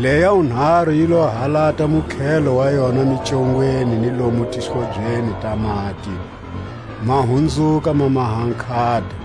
Leʼya wunharu yi lo halata mukhelo wa yona micongweni ni lomu tihlobyeni ta mati, ma hunzuka ma maha nkhata.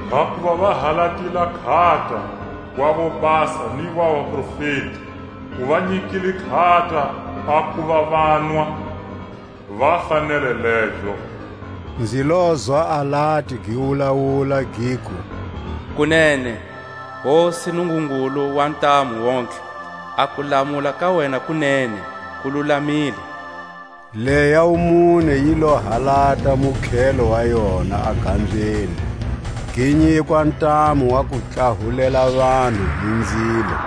Hakuva va halatile a nkhata wa vobasa ni wa vaprofeti; u va nyikile nkhata a kuva vanwa, va fanele lezo. Nzi lozwa alati gi wulawula, giku: Kunene, Hosi Nungungulu wa Ntamu-wontlhe, a kulamula ka wena ku nene, ku lulamile. Leʼya wumune yi lo halata mukhelo wa yona a gambyeni; gi nyikwa ntamu wa ku tlahulela vanhu hi nzilo.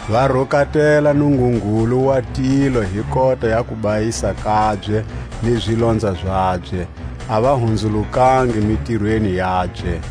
va rukatela Nungungulu wa tilo hi kota ya kubayisa kabye ni zilonza zabye; a va hunzulukangi mitirweni yabye.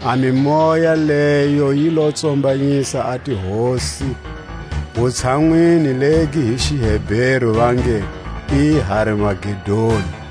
A mimoya leyo yi lo tsombanyisa a tihosi wutshanwini legi hi xiHeberu va nge i Har-Magedoni.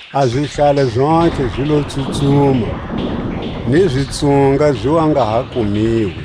A zihlale zontlhe zi lo tsutsuma, ni zitsunga zi wa nga ha kumiwi.